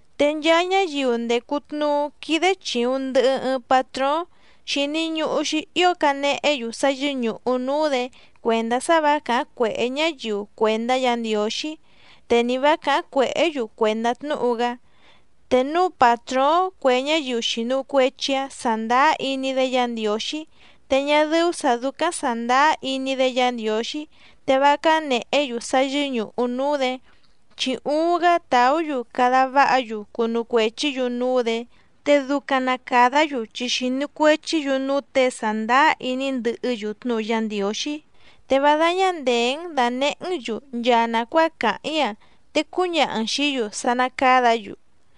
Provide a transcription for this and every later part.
Te nchaa ñáyiu ndècu tnuú quídé chìuⁿ ndɨhɨ ɨɨⁿ patróóⁿ xìni ñuhu‑xi ío canehé‑yu sá yɨ́ñùhu núú‑dě cuèndá sá vǎ càháⁿ cuèhé ñáyiu cuèndá Yǎ Ndiǒxí, te ni vǎ càháⁿ cuèhé‑yu cuèndá tnúhu‑gá. Te núu pàtróóⁿ cue ñáyiu xìnu cuechi‑áⁿ sàndáá iní‑dé Yǎ Ndiǒxí, te ñá dɨ́ú sǎ dúcáⁿ sàndáá iní‑dé Yǎ Ndiǒxí te vá cánèhé‑yu sá yɨ́ñùhu núú‑dě, chi uuⁿ‑gá tàú‑yu cada váha‑yu cunu cuèchí‑yu núú‑dě, te ducaⁿ na càdá‑yu chi xìnu cuechí‑yu núú těe sàndáá iní ndɨhɨ́‑yu tnúhu Yá Ndiǒxí. Te vá dáñá ndèé‑n dànehé‑n‑yu nchaa nàcuáa càháⁿ‑í‑a, te cúñaha‑n xìí‑yu sá ná càdá‑yu.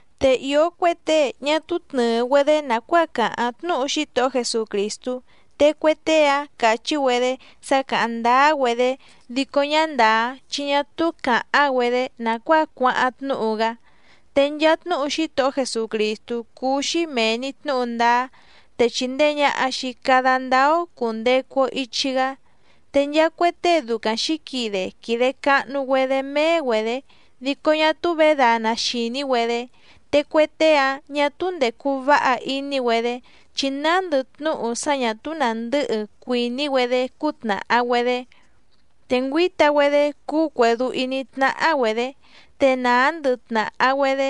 Te ìó cue tée ñá túú tnɨ̀ɨ‑güedé nàcuáa càháⁿ tnúhu Xítohó Jesucrìstú, te cue tée‑áⁿ càchí‑güedé sá càháⁿ ndáá‑güedé dico ñá ndàá, chi ñá túú càháⁿ‑güedé nàcuáa cuáháⁿ tnúhu‑gá. Te nchaa tnúhu Xítohó Jesucrìstú cúú‑xí mèe‑ni tnúhu ndáá, te chìndee ñaha‑xi cada ndáá‑ó cùndecu‑o ichi‑gá. Te nchaa cue tée ducaⁿ xǐquide quìde cahnu‑güedé méé‑güedě dico ñá túú vědana xìní‑güedé, te cue tée‑áⁿ ñà túú ndècu váha iní‑güedé chi nándɨ tnúhu sá ñà túú nàndɨ́hɨ cuìní‑güedé cútnàha‑güedé. Te ngüǐta‑güedé cúú cuèdú íní tnáhá‑güedě, te nàá ndɨhɨ tnàhá‑güedé,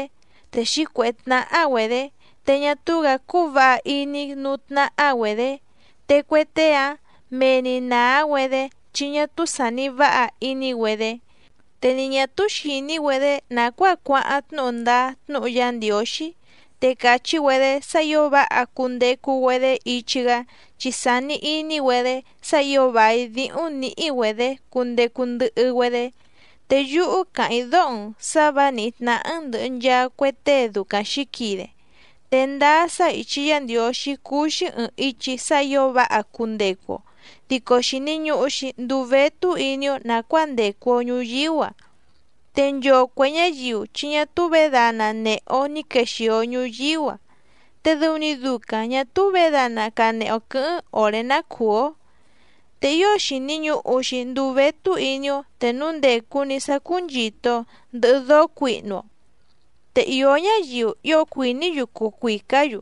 te xǐcuèhé tnáhá‑güedě, te ñá túú‑gǎ cúú vǎha iní núú tnáhá‑güedě. Te cue tée‑áⁿ mee‑ni nàá‑güedé chi ñá túú sàni váha iní‑güedé, te ni ñà túú xìní‑güedé nàcuáa cuáháⁿ tnúhu ndáá tnúhu Yá Ndiǒxí, te càchí‑güedé sá ǐo váha cundecu‑güedé ichi‑gá chi sàni iní‑güedé sá ǐo vài díhúⁿ nǐhí‑güedě cundecu ndɨhɨ‑güedé. Te yúhú càháⁿ‑í dóho‑n sǎ vǎ nìhí tnáhá‑n ndɨ̀hɨ nchaa cue tée ducaⁿ xǐquide. Te ndáá sá ìchi Yá Ndiǒxí cúú‑xí ɨ̀ɨⁿ ichi sá ǐo váha cundecu‑o, dico xìni ñuhu‑xi nduu vétú iní‑ó nàcuáa ndècu‑o ñuyíú‑a. Te nchoo cuè ñáyiu chi ñá túú vědana nèhe‑o ní quexìo ñuyíú‑a, te dɨu‑ni ducaⁿ ñà túú vědana canehe‑o quɨ̌hɨ́ⁿ òré ná cùú‑ó. Te ío xìni ñuhu‑xi nduu vétú iní‑ó te núu ndècu‑ni sá cúnchìto‑o ndɨhɨ dóó cuihnu‑o. Te ìó ñáyiu ío cuìní‑yu cuu cuìcá‑yu,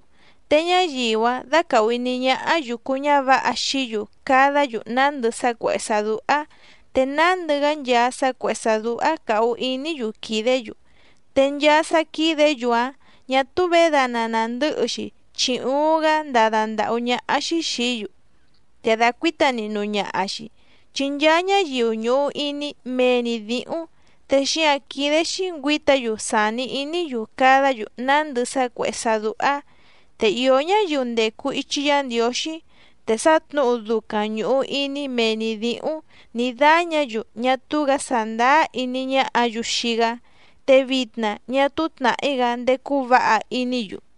te ñáyiu‑áⁿ dácàhu iní ñáhá yùcu ñávǎha xií‑yu cadá‑yu nándɨ sá cuèhé sá dúhá, te nándɨ‑gá nchaa sá cuèhé sá dúhá càhu iní‑yu quìdé‑yu, te nchaa sá quídě‑yu‑áⁿ ñà túú vědana nàndɨ́hɨ‑xi chi uuⁿ‑gá ndádá ndàhú ñáhá‑xí xìí‑yu, te dàcuíta nihnu ñaha‑xi. Chi nchaa ñáyiu ñùhu iní mee‑ni dǐhúⁿ, te xíǎⁿ quídé‑xí ngüǐta‑yu sàni iní‑yu cadá‑yu nándɨ sá cuèhé sá dúhá. Te ìó ñáyiu ndècu ichi Yá Ndiǒxí te sá tnǔhu ducaⁿ ñùhu iní mee‑ni dǐhúⁿ nǐ dáñǎ‑yu ñá túú‑gǎ sàndáá iní ñáhǎ‑yu xii‑gá, te vitna ñá túú tnàhí‑gá ndécú vǎha iní‑yu.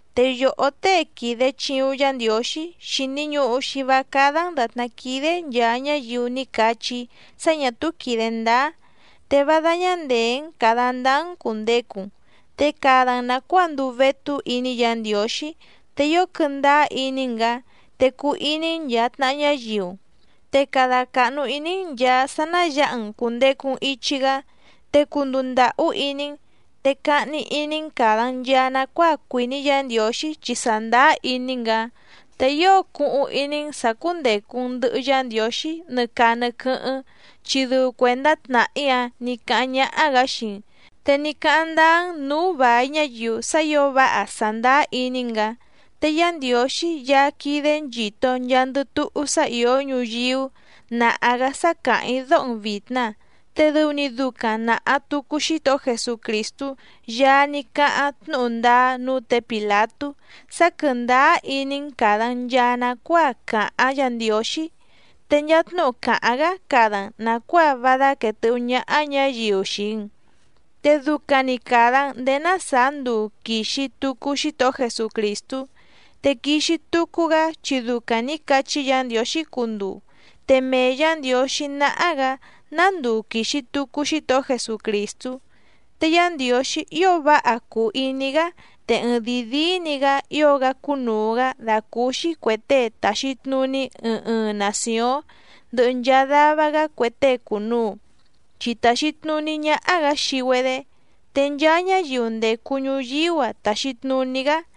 Te yòhó tée quìde chiuⁿ Yá Ndiǒxí xìni ñuhu‑xi vá cádá‑n dàtná quídé nchàa ñáyiu ní cachí‑í sá ñà túú quìde ndáá, te vá dáñá ndèé‑n càda ndáá‑n cùndecu‑n, te cada‑n nàcuáa nduu vétú iní Yǎ Ndiǒxí, te ío quɨndáá iní‑n‑gǎ, te cuu iní‑n nchàa tnaha ñáyiu‑n, te cada càhnu iní‑n nchàa sá ná yǎha‑n cùndecu‑n ichi‑gá, te cunduu ndàhú iní‑n. Te cahni iní‑n càda‑n nchaa nacuáa cuìní Yǎ Ndiǒxí chi sàndáá iní‑n‑gǎ, te ío cuhuⁿ iní‑n sǎ cúndècu‑n ndɨhɨ Yá Ndiǒxí nɨ caa nɨ quɨ́hɨ́ⁿ, chi dɨu cuèndá tnàhí‑áⁿ nì cáháⁿ ñáhá‑gǎ xii‑n, te ní cáháⁿ ndáá‑n nǔú vài ñáyiu sá ǐo váha sàndáá iní‑n‑gǎ. Te Yá Ndiǒxí Yaá quídé nchìto nchaandɨ túhú sá ìó ñuyíú nàha‑gá sá càháⁿ‑í dóho‑n vìtna, te dɨu‑ni ducaⁿ nàha tucu Xítohó Jesucrìstú Yaá ní cáháⁿ tnúhu ndáá núú tě Pìlatú sá quɨ̀ndáá iní‑n càda‑n nchaa nacuáa càháⁿ Yǎ Ndiǒxí, te nchaa tnúhu càháⁿ‑gá cada‑n nàcuáa vá dáquèe tɨ́hú ñáhá ñǎyiu xii‑n, te ducaⁿ‑ni càda‑n ndéé ná sàá nduu quìxi tucu Xítohó Jesucrìstú. Te quixi tucu‑gá chi ducaⁿ nǐ cachí Yǎ Ndiǒxí cunduu, te mee Yǎ Ndiǒxí náhá‑gǎ ná nduu quìxi tucu Xítohó Jesucrìstú. Te Yá Ndiǒxí ío váha cùu iní‑gá te ɨɨⁿdìi díí‑ni‑gǎ ío‑gá cúnùu‑gá dàcúúxí cuè tée tàxi tnuní ɨɨⁿ ɨɨⁿ nàcióⁿ ndɨhɨ nchaa dava‑gá cue tée cùnuu, chi tàxi tnuní ñáhá‑gǎ xii‑güedé, te nchaa ñáyiu ndècu ñuyíú‑a tàxi tnuní‑gá.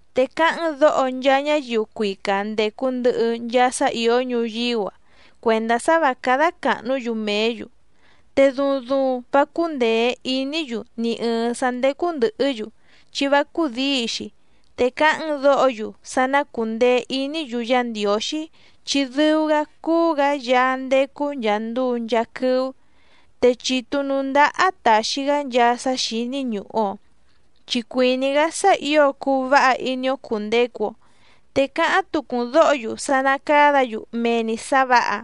Te cáháⁿ‑n dǒho nchaa ñáyiu cuica ndècu ndɨhɨ nchaa sá ìó ñuyíú‑a cuèndá sá vǎ cádá càhnú‑yu mèé‑yu, te duuⁿ duuⁿ vá cúndèé iní‑yu ni ɨ̀ɨⁿ sá ndécú ndɨ̀hɨ́‑yu chi vá cúdǐi‑xi, te cáháⁿ‑n dǒho‑yu sá ná cùndeé iní‑yu Yá Ndiǒxí chi dɨu‑gá cúú‑gǎ Yaá ndécú nchàa nduu nchaa quɨ́ú, te chitu nǔú ndáhá tàxi‑gá nchaa sá xíní ñùhu‑o, chi cuìní‑gá sá ǐo cuu váha iní‑ó cùndecu‑o. Te cáháⁿ tucu‑n dǒho‑yu sá ná càdá‑yu mee‑ni sǎ vǎha,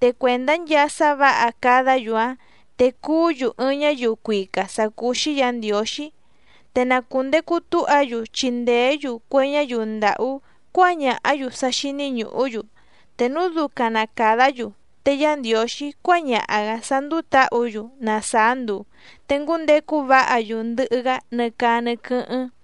te cuèndá nchaa sá vǎha cadá‑yu‑áⁿ te cuú‑yu ɨɨⁿ ñáyiu cuica sǎ cúú‑xí Yǎ Ndiǒxí, te na cùndecu túha‑yu chindèé‑yu cue ñáyiu ndàhú cuáñàhá‑yu sá xíní ñùhú‑yu. Te núu ducaⁿ na càdá‑yu te Yá Ndiǒxí cuáñaha‑gǎ sá ndúú tǎhǔ‑yu na sàá nduu, te ngúndecu váha‑yu ndɨhɨ‑gá nɨ caa nɨ quɨ́hɨ́ⁿ.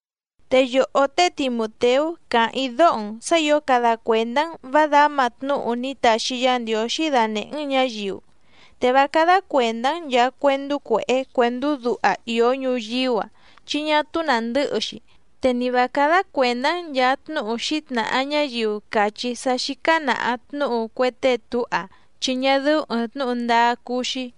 Te yòhó té Timùteú càháⁿ‑í dóho‑n sǎ ǐo cada cuèndá‑n vǎ dǎma tnúhu ní taxi Yá Ndiǒxí danèhé‑n ñǎyiu, te vá cádá cuèndá‑n nchàa cuendú cuèhé cuèndú duha ìó ñuyíú‑a chi ñá túú nàndɨ́hɨ‑xi, te ni vǎ cádá cuèndá‑n nchàa tnúhu xǐtnàha ñáyiu càchí sá xícá nàha tnúhu cue tée túha chi ñá dɨ́ú ɨ̀ɨⁿ tnúhu ndáá cúú‑xí.